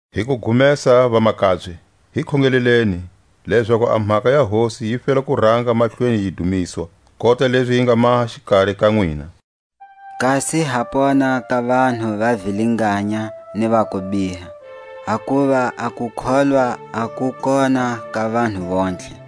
Hi kugumesa, vamakabye, hi khongeleleni, lezaku a mhaka ya Hosi yi fela ku ranga mahlweni yi dumiswa, kota lezi yi nga maha xikari ka nwina; kasi ha pona ka vanhu va vilinganya ni va kubiha; hakuva a kukholwa a ku kona ka vanhu vontlhe.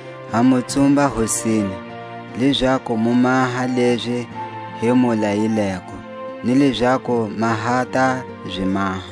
Ha mu tsumba Hosini, lezaku mu maha lezi hi mu layileko, ni lezaku ma ha ta zi maha.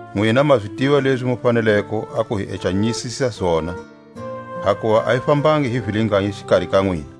Nwina ma zi tiva lezi mu faneleko a ku hi ecanyisisa zona, hakuva a hi fambangi hi vilinganya xikari ka nwina.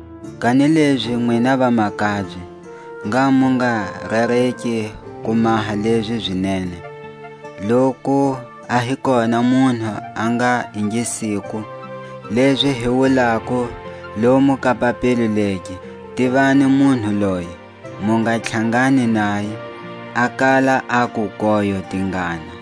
Kanilezi nwina vamakabye, ngha mu nga rereki ku maha lezi zi nene. Loku a hi kona munhu a nga ingisiko lezi hi wulako lomu ka papilo legi, tivani munhu loye, mu nga tlhangani naye, a kala aku koyo tingana.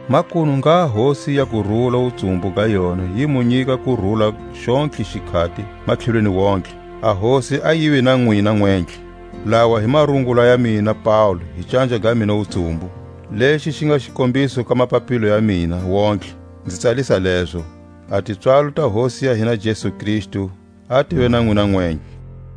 Makunu ngha Hosi ya kurula wutsumbu ga yona yi mu nyika kurula xontlhe xikhati matlhelweni wontihe. A Hosi a yive na nwina nwentlhe. Lawa hi marungula ya mina Paule hi canja ga mina wutsumbu, lexi xi nga xikombiso ka mapapilo ya mina wontihe; nzi tsalisa lezo. A tipswalo ta Hosi ya hina Jesu Kristu a tive na nwina nwentlhe.